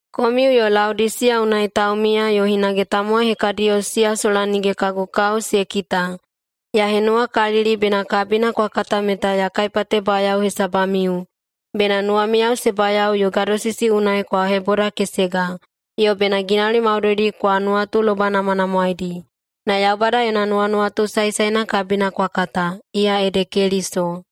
Komiu yo Laodisiya unai taumiya yo hinage tamowai hekadiyo siya sola nige kagu kao se kita, ya henuwakalili bena kabina kwa kata meta ya kaipatebayao hesabamiu, bena nuwamiyao se bayao yo gadosisi unai kwa hebodakesega, yo bena ginauli maudoidi kwa nuwatulobainamwanamwaedi, na Yaubada yona nuwanuwatu saesaena kabina kwa kata, iya ede Keliso.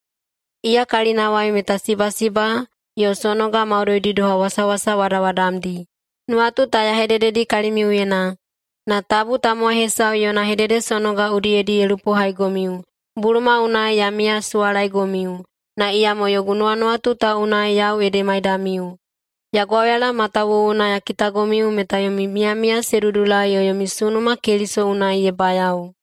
Iya kalinawai meta sibasiba yo sonoga maudoidi doha wasawasa wadawadamdi. Nuwatu ta ya hedededi kalimiuyena, na tabu tamowai hesau yona hededesonoga udiyedi ye lupohaigomiu. Buluma unai ya miyasuwalaegomiu, na iyamo yogu nuwanuwatu ta unai yau ede maidamiu. Ya gwauyala matawuwuna ya kitagomiu meta yomi miyamiya se dudulai yo yomi sunuma Keliso unai ye bayao.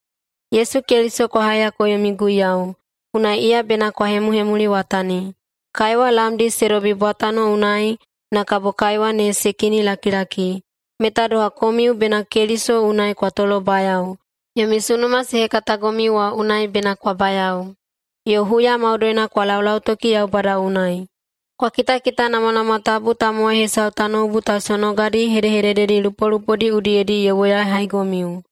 Yesu Keliso kwa haiyako yomi Guiyau, unai iya bena kwa hemuhemuliwatani. Kaiwa lamdi se dobi bwatano unai na kabo kaiwa ne se kinilakilaki, meta doha komiu bena Keliso unai kwa tolobayao. Yomi sunuma se hekatagomiu wa unai bena kwa bayao, yo huya maudoina kwa laulautoki Yaubada unai. Kwa kitakitanamwanamwa tabu tamowai hesau tanoubu ta sonogadi hedehedededi lupolupodi udiyedi ye woyahaigomiu.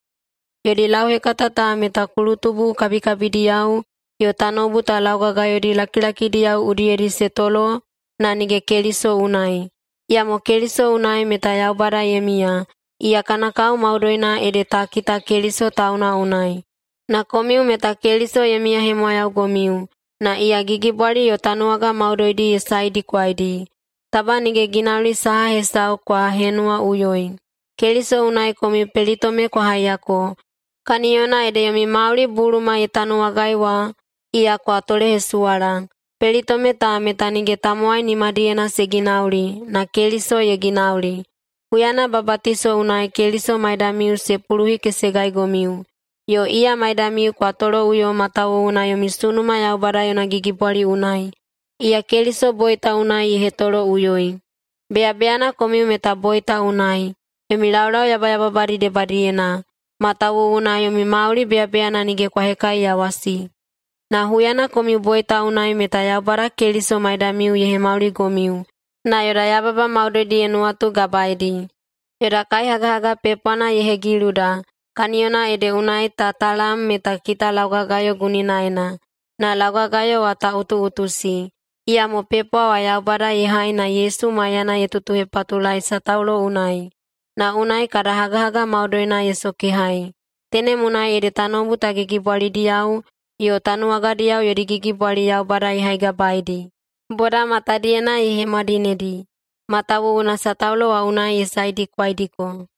Yodi lauhekata ta meta kulutubu kabikabidiyao yo tanoubu ta laugagayodi lakilakidiyao udiyedi se tolo na nige Keliso unai. Iyamo Keliso unai meta Yaubada ye miya. Iya kana kao maudoina ede ta kita Keliso tauna unai. Na komiu meta Keliso ye miyahemwayaugomiu, na iya gigibwali yo tanuwaga maudoidi ye saedikwaidi. [Taba nige ginauli saha hesau kwa henuwaꞌuyoi.] Keliso unai komiu pelitome kwa haiyako, kaniyona ede yomi mauli buluma ye tanuwagai wa, iya kwa tolehesuwala. Pelitome ta meta nige tamowai nimadiyena se ginauli, na Keliso ye ginauli huyana babatiso unai Keliso maidamiu se puluhikesegaigomiu. Yo iya maidamiu kwa toloꞌuyo matawuwuna yomi sunuma Yaubada yona gigibwali unai, iya Keliso boita unai ye hetoloꞌuyoi. Beyabeyana komiu meta boita unai, yomi laulau yabayababadi debadiyena, matawuwuna yomi mauli beyabeyana nige kwa hekaiyawasi. Na huyana komiu boita unai meta Yaubada Keliso maidamiu ye hemauligomiu, na yoda yababa maudoidi ye nuwatugabaedi. Yoda kaihagahaga pepwana ye hegiluda, kaniyona ede unai ta talam meta kita laugagayo guninaena, [na laugagayo wa ta utuꞌutusi]. Iyamo pepwa wa Yaubada ye hai na [Yesu maiyana] ye tutuhepatulaei sataulo unai, na unai kada hagahaga maudoina ye sokehai. Tenem unai ede tanoubu ta gigibwalidiyao yo tanuwagadiyao yodi gigibwali Yaubada ye haigabaeidi. Boda matadiyena ye hemwadinedi, matawuwuna sataulo wa unai ye saedikwaidiko.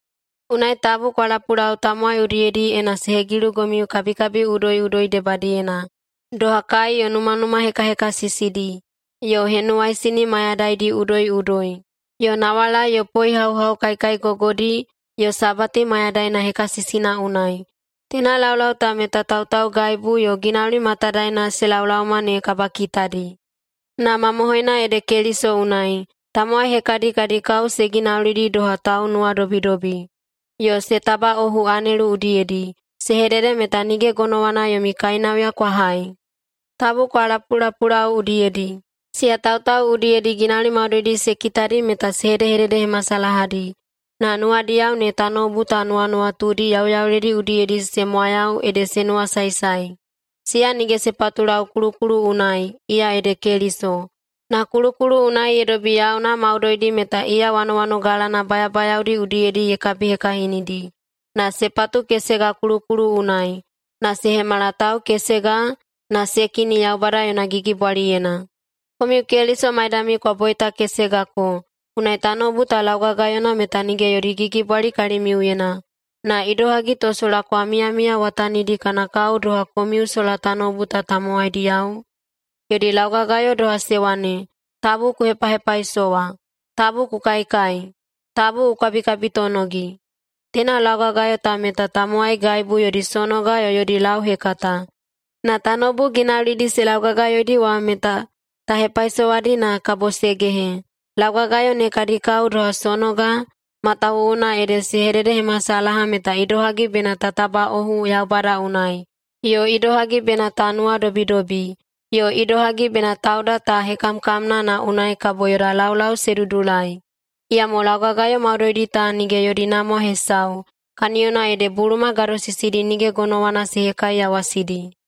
Unai tabu kwa lapulau tamowai udiyedi ena se hegilugomiu kabikabi udoiꞌudoi debadiyena, doha kai yo numanuma hekahekasisidi, yo henuwaisini mayadaidi udoiꞌudoi, yo nawalai ye poehauhau kaikaigogodi yo Sabati mayadaina hekasisina unai. Teina laulau ta meta tautaugaibu yo ginauli matadaena se laolaoma ne kabakitadi. Na mamohoina ede Keliso unai. Tamowai hekadi kadi kao se ginaulidi doha taunuwadobidobi, yo se tabaꞌohu anelu udiyedi. Se hedede meta nige gonowana yomi kainauya kwa hai. Tabu kwa lapulapulau udiyedi! Siya tautau udiyedi ginauli maudoidi se kitadi meta se hedehededehemasalahadi, na nuwadiyao ne tanoubu ta nuwanuwatudi yauyauledi udiyedi se mwayau ede se nuwasaesae. Siya nige se patulau kulukulu unai, iya ede Keliso. Na kulukulu unai ye dobi yauna maudoidi meta iya wanowanogalana bayabayaodi udiyedi ye kabihekahinidi, na se patukesega kulukulu unai, na se hemala tau kesega na se kini Yaubada yona gigibwaliyena. Komiu Keliso maidamiu kwa boitakesegako, unai tanoubu ta laugagayona meta nige yodi gigibwali kalimiuyena. Na idohagi to sola kwa miyamiyawatanidi kana kao doha komiu sola tanoubu ta tamowaidiyao? Yodi laugagayo doha se wane, “Tabu ku hepahepaisowa! Tabu ku kaikai! Tabu ku kabikabitonogi!” Teina laugagayo ta meta tamowaigaibu yodi sonoga yo yodi lauhekata. Na tanoubu ginaulidi se laugagayoidi wa meta ta hepaisowadi na kabo se gehe. Laugagayo ne kadi kao doha sonoga, matawuwuna ede se hededehemasalaha meta idohagi bena ta tabaꞌohu Yaubada unai, yo idohagi bena ta nuwadobidobi, yo idohagi bena tauda ta hekamkamna na unai kabo yoda laulau se dudulai. Iyamo laugagayo maudoidi ta nige yodi namwa hesau, kaniyona ede buluma gadosisidi nige gonowana se hekaiyawasidi.